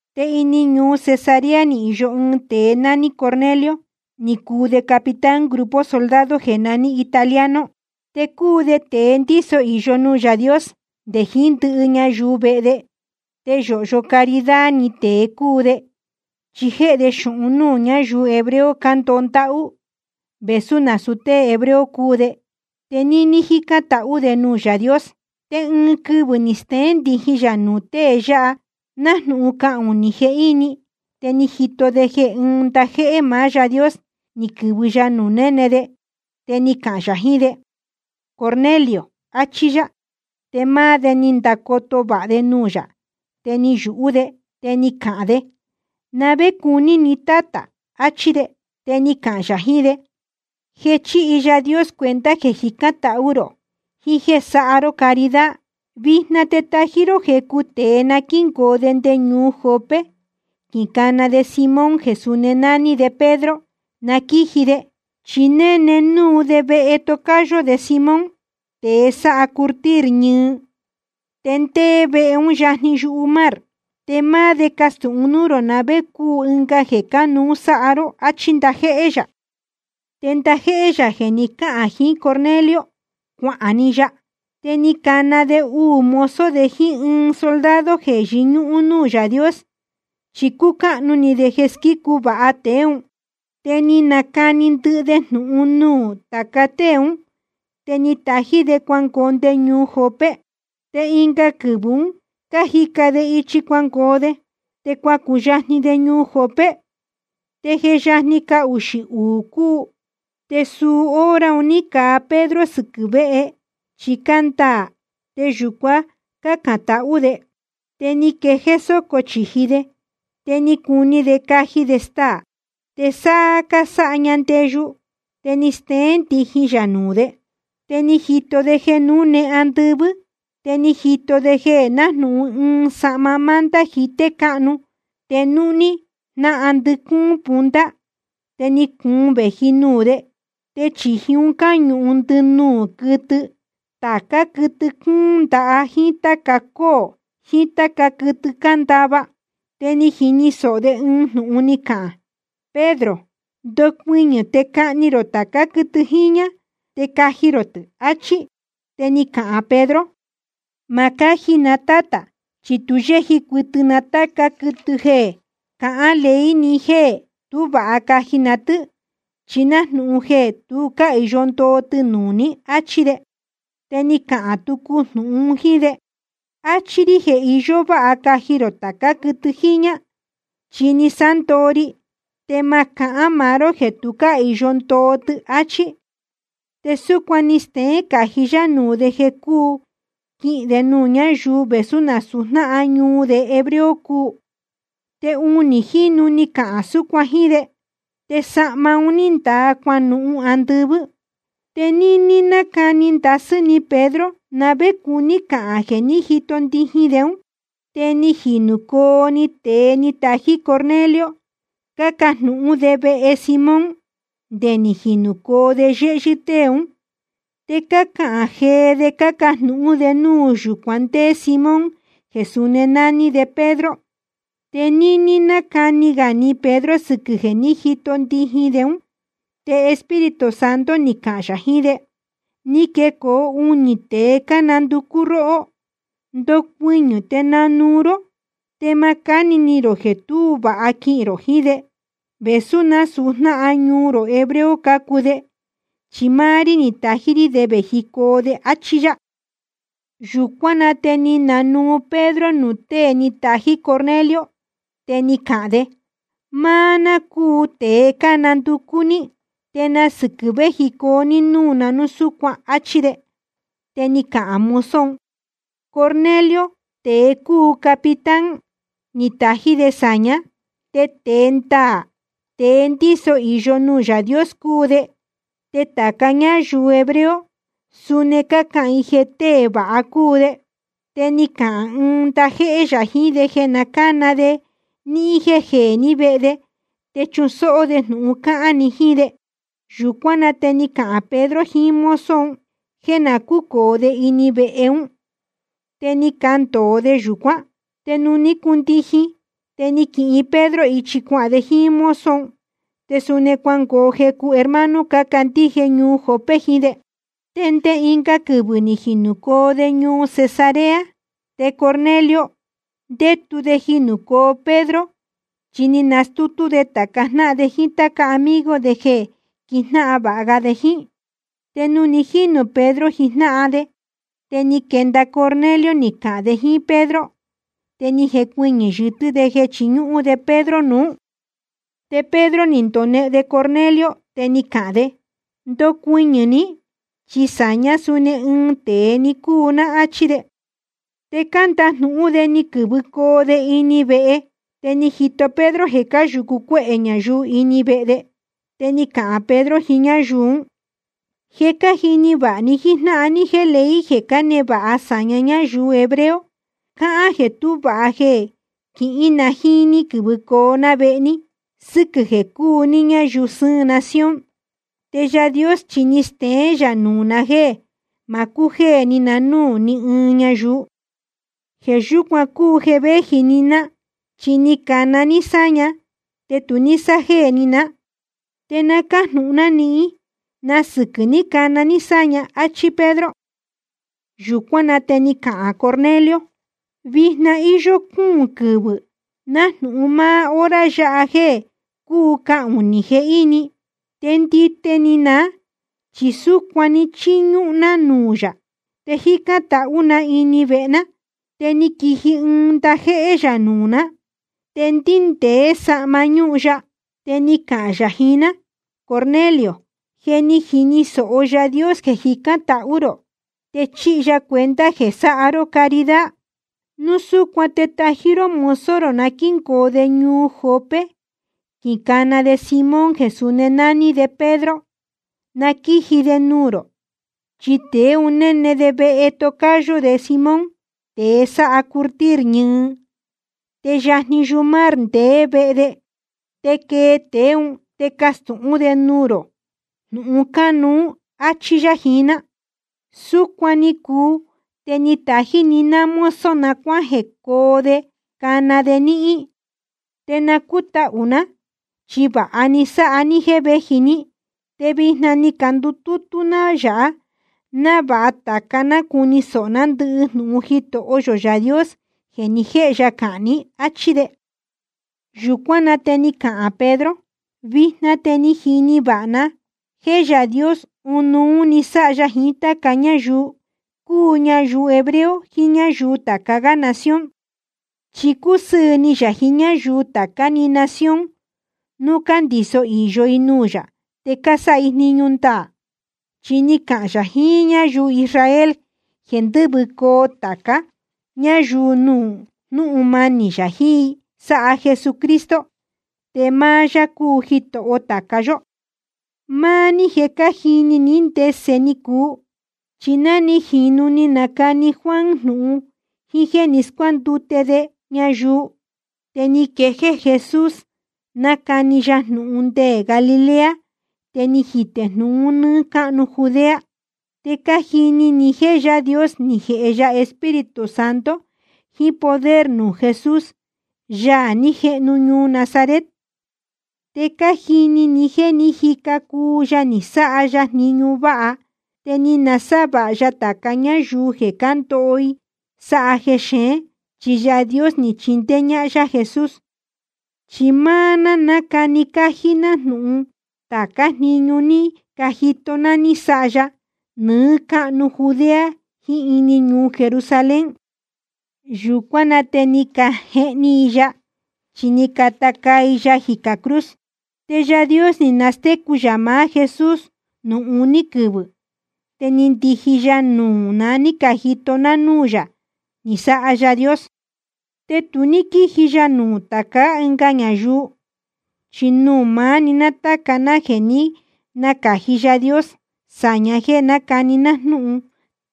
Te ini ñuu Cesarea ni īyo ɨɨn tēe nání Cornelio, ni cuu de capitán grupo soldado jeē naní Italiano. Te cúu de tēe ndíso īyo nuū Yaā Dios nde jiín ndɨhɨ ñayuu vehe de, te yōhyo caridad ni tēe cúu de, chi jéhe de xūhun núū ñáyuu hebreo cándoho ndáhú, vēsú nasūu tée hebreo cúu de. Te níní jícán tahú de nuū Yaā Dios. Te ɨɨn quɨvɨ̄ ni steén ndijin yā nuū tēe yáha nájnūhun cahunī jehíni, te ni jito de jeē ɨ́ɨn ndajéhé maá Yáā Dios ni quɨ̄vɨ ya nuū néne de. Te ni cahān yā jiín de: Cornelio, achí yá. Te máá de ni ndacoto vāha de nuū yā, te ni yūhú de. Te ni cahān de: ¿Na vé cuní ni, Tátā? achí de. Te ni cahān yā jiín de: Je chíhi Yaā Dios cuenta jeē jicán tahú rō jiín jéē sáha ró caridad. Vijna te tají ró jecu tēe na quíngoo de nde ñuu Jope, quicana de Simón jeē suni nání de Pedro, na quíji de. Chi néne núu de vehe tocayo de Simón, tēe sáha curtir ñɨɨ, te ndéé vehe ún yajni yumar. Te máá de castūhun núū rō na vé cúu ɨnga jeē cánuú sáhá ró, áchí ndajéhé yā. Te ndajéhé yā jeē ni cáhān jiín Cornelio, cuahān‑ni ya. Te ni cana de uū mozo de jíín ɨɨn soldado jeē yɨñúhún núū Yaā Dios, chi cúcáhnu ni de jeē squícu vāha tēe ún. Te ni nacani ndɨhɨ de jnūhun nuū tāca tée ún, te ni tají de cuangoo nde ñuu Jope. Te ɨnga quɨvɨ̄ un cájica de ichi cuangoo de, te cuacuyajni de ñuu Jope. Te je yajni cahuxī uū cúu, te suu hora un ní caa Pedro sɨquɨ̄ véhe chi cándaā, te yūcuan cácān tahú de. Te ni quee sōco chīji de, te ni cuni de caji de staā. Te sáá cásáha ña ndeyu te ni steén ndijin yā nuū de. Te ni jito de jeē núne andɨvɨ́. Te ni jito de nájnūhun ɨɨn sahma manta jité cáhnu te núhní jnáhan ndɨcúún punta, te ni cuun vēji nuū de. Te chīji un cáñūhun ndɨnuū quɨtɨ, tācá quɨtɨ cúún ndaha jíín táca cóō jiín táca quɨtɨ cándava. Te ni jini sōho de ɨɨn jnūhun ni cahān: Pedro, ndocuɨñɨ̄ te cahni rō tācá quɨtɨ jiñā, te caji rō tɨ̄, áchí. Te ni cahān Pedro: Ma cáji na, Tátā, chi tu yéji cuɨtɨ na táca quɨtɨ jeē cahán ley ni jéē tú vāha caji na tɨ́, chi nájnūhun jeē tu cáhīyo ndoo tɨ nuū ní, áchí de. Te ni cahān tucu jnūhun un jíín de: Achí rí jeē iyó váha caji rō tācá quɨtɨ jiñā, chi ni sándoo ri, te ma cahán maá ró jeē tu cáhīyo ndoo tɨ, áchí. Te súcuan ni steén cají yá nuū de jeē cúu quihīn de nuū ñáyuu vēsú násūu jnáhan ñuu de hebreo cúu. Te unī jínu ni cahān súcuan jíín de. Te sahma un ní ndaa cuanuhun andɨvɨ́. Te níní nácani ndasɨ́ ni Pedro na vé cuní cahān jeē ní jito ndijin de ún, te ni jinūcoo‑ni tēe ni tají Cornelio, cácajnūhún de vehe Simón nde ni jinūcoo de yéhyɨ́ tée ún. Te cácahān jee de cácajnūhún de núu yūcuan ndéé Simón jeē suni nání de Pedro. Te níní nácani ga ni Pedro sɨquɨ̄ jeē ní jito ndijin de ún, te Espíritu Santo ni cahān yā jiín de: Ni quecoo unī tēe cánanducú róhó. Ndocuɨñɨ̄ te nanuu ró, te ma cáni ni rō jeē tú vāha quihīn rō jiín de, vēsú nasūu jnáhan ñuu rō hebreo cácuu de, chi máá rí ni tají rí de vējicoo de, áchí yá. Yūcuán na te ni nanuu Pedro nuū tée ni tají Cornelio, te ni cahān de: Máá ná cúu tēe cánanducú ní. ¿Te na sɨquɨ̄ vējicoo ní núū na núu súcuan? áchí de. Te ni cacahān mozo un: Cornelio, tēe cúu capitán, ni tají de sāñá. Te tēe ndaā, tēe ndíso īyo nuū Yaā Dios cúu de, te tāca ñáyuu hebreo suni cácahān i jeē tée vāha cúu de. Te ni cahān ɨɨn ndajéhé yā jiín de jeē na cána de níhín jéē ní vehe de te chusóhó de jnūhun cahān ni jíín de. Yūcuán na te ni cahān Pedro jiín mozo un jéē na cúcōo de ini vehe ún, te ni candōo de yūcuán. Te nuū ní cundijin, te ni quihin Pedro ichi cuahān de jíín mozo un. Te suni cuangoo jecu hermano cácandíje ñuu Jope jiín de. Te nde ɨnga quɨvɨ̄ ni jinūcoo de ñuu Cesarea. Te Cornelio ndétu de jinūcoo Pedro, chi ni nastútú de tāca jnáhan de jíín táca amigo de jeē quijnáhan vāha ga de jíín. Te nuū ni jínū Pedro jijnáhan de, te ni quenda Cornelio ni cahān de jíín Pedro, te ni jecuɨñɨ̄ yɨtɨ́ de jeē chiñúhún de Pedro nuú. Te Pedro ni ndonehen de Cornelio, te ni cahān de: Ndocuɨñɨ̄ ní, chi sāñá suni ɨɨn tēe‑ni cúu ná, áchí de. Te cándajnūhún de ni quɨ̄vɨcoo de ini vehe. Te ni jito Pedro jeē cáyūcu cuéhē ñayuu ini vehe de. Te ni cahān Pedro jiín ñáyuu ún: Je cájini vāha ni jíjnáhan ní jéē ley jeē cánevāha sāña ñáyuu hebreo, cáhán jeē tú vāha jeē quijnáhan ná jíín ní quɨ̄vɨcoo ná vehe ní sɨ́quɨ̄ jeē cúu ní ñáyuu sɨ́ɨn nación. Te Yaā Dios chi ni steén yā nuū na jéē ma cujéē ni na núū ní ɨɨn ñayuu. Jeē yúcuan cúu jeē vēji‑ni ná, chi ni cana ní sáña, te tu ní sájéē ni ná. Te na cájnūhun ná nihín, ¿na sɨquɨ̄ ni cana ní sáña? áchí Pedro. Yūcuán na te ni cahān Cornelio: Vijna íyó cúūn quɨvɨ̄ nájnūhun máá hora yáha jéē cúu cahunī jehíni, te ndite ni ná chi súcuan chíñúhún ná nuū yā, te jícán tahú na ini vehe ná. Te ni quiji ɨɨn ndajéhé yā nuū ná, te ndíndēé sahma ñúhun ya. Te ni cahān yā jiín ná: Cornelio, je ni jini sōho Yaā Dios jeē jicán tahú rō, te chíhi ya cuenta jeē sáha ró caridad. Núu súcuan te tají ró mozo na quíngoo de ñuu Jope quicana de Simón jeē suni nání de Pedro, na quíji de nuū rō. Chi tēe un néne de vehe tocayo de Simón, tēe sáha curtir ñɨɨ, te yajni yumar ndeé vehe de. Te quee tēe ún te castūhún de nuū rō jnūhun cánuú, áchí yá jiín ná. Súcuan ni cuu te ni tají‑ni ná mozo na cuajēcoo de cana de níhín, te na cútahū ná, chi vāha ni sáha ní jéē véji ní. Te vijna ni candutútú ná yāha návāha tāca ná cuni sōho ná ndɨhɨ jnūhun Jitoho yō Yaā Dios jeē ni jéhe ya cahān ní, áchí de. Yūcuán na te ni cahān Pedro: Vijna te ni jini vāha ná jéē Yaā Dios ɨnuú‑ni sáha ya jiín táca ñáyuu, cúu ñayuu hebreo jiín ñáyuu tāca gá nación. Chi cúsɨɨ̄ ni yā jiín ñáyuu tācá‑ni nación núu cándīso īyo i nuū ya te cásáha i jniñu ndaā. Chi ni cahān yā jiín ñáyuu Israel jeē ndɨ́vɨcoo tāca ñáyuu nuū jnúhun manī yā jiín i sáha Jesucristo. Te máá yá cúu Jitoho tāca yóhó. Máá ní je cájini ní ndese ni cuu. Chi ná ni jīnu ni nacani Juan jnūhun jíín jéē ni scuándute de ñayuu, te ni quejéé Jesús nácani ya jnūhun nde Galilea, te ni jitē jnūhun un nɨ́ɨ́ cáhnu Judea. Te cájini ni jéē Yaā Dios ni jēhe ya Espíritu Santo jiín poder nuū Jesús, Yaā ní jehnu ñuu Nazaret. Te cájini ni jéē ní jica cuu ya ni sáha ya jniñu váha, te ni nasávāha ya tāca ñáyuu jeē cándoho i sáha jexeén, chi Yaā Dios ni chindéé ñáhán yá Jesús. Chi máá ná cánacani cájí ná jnūhun tācá jniñu ní cajito ná ní sáha ya nɨɨ́ cáhnu Judea jiín ini ñuu Jerusalén. Yūcuán na te ni cajehni i ya, chi ni cata caa i ya jicā cruz. Te Yaā Dios ni nastécu yā maá Jesús nuū uní quɨvɨ̄, te ni ndiji ya nuū na ní cajito ná núū yā ni sáha Yaā Dios. Te tu ní quíji ya nuū tācá ɨnga ñayuu, chi nuū maá‑ni tāca ná jeē jé ni nacāji Yaā Dios sāña jéē nácani ná jnúhun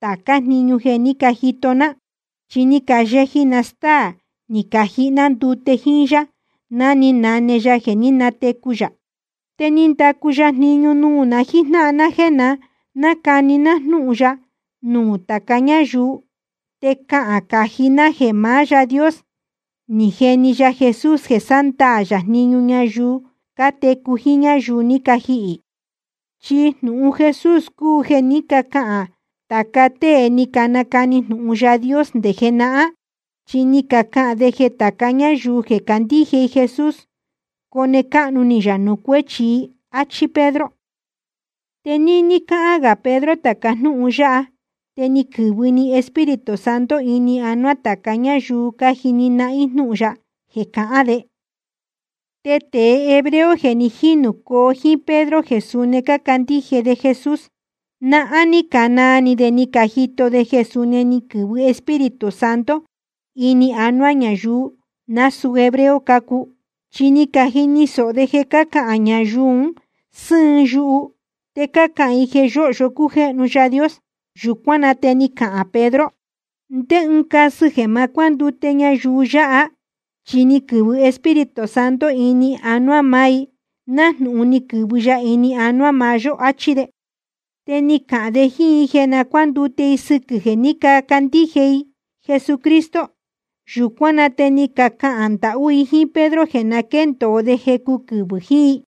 tācá jniñu jeē ní cajito ná. Chi ni cayeji na stáā ni cajihi ná ndute jíín yá ná ni nane ya jeē ní natecu yā. Te ni ndacu ya jniñu nuū na jíjnáhan ná jéē na nácani ná jnúhun ya nuū tāca ñáyuu te cahān cají ná jeē maá Yáā Dios ni jeni ya Jesús jeē sándaā yā jniñu ñayuu cátecu jiín ñáyuu ní cajihī. Chi jnūhun Jesús cúu jeē ní cacahān tāca tée ni canacani jnūhun Yaā Dios nde jenahán. Chi ni cacahān de jeē tāca ñáyuu jeē candíje i Jesús, cone cáhnu ni yā nuū cuéchi i, áchí Pedro. Te níní cáhán gā Pedro tāca jnúhun yáha te ni quɨ̄vɨ‑ni Espíritu Santo ini anuá tāca ñáyuu cájini nahín jnūhun ya jeē cahán de. Te tēe hebreo jeē ni jínūcoo jíín Pedro jeē suni cácandíje de Jesús, nahán ní canaa ni de ni cajito de jeē suni ni quɨ̄vɨ Espíritu Santo ini anuá ñayuu jeē násūú hebreo cácuu. Chi ni cajini sōho de cácahān ñayuu un sɨ́ɨn yuhu, te cácahān i jeē yōhyo cújéhnu Yaā Dios. Yūcuán na te ni cahān Pedro: ¿Ndé ɨɨn casɨ jeē ma cuándute ñayuu yáha? Chi ni quɨ̄vɨ Espíritu Santo ini anuá maá i, nájnūhun ni quɨ̄vɨ ya ini anuá maá yó, áchí de. Te ni cahān de jíín i jeē na cuándute i sɨquɨ̄ jeē ní cacandíje i Jesucristo. Yūcuán na te ni cacahān ndahú i jíín Pedro jeē na quéndōo de jecu quɨvɨ̄ jiín i.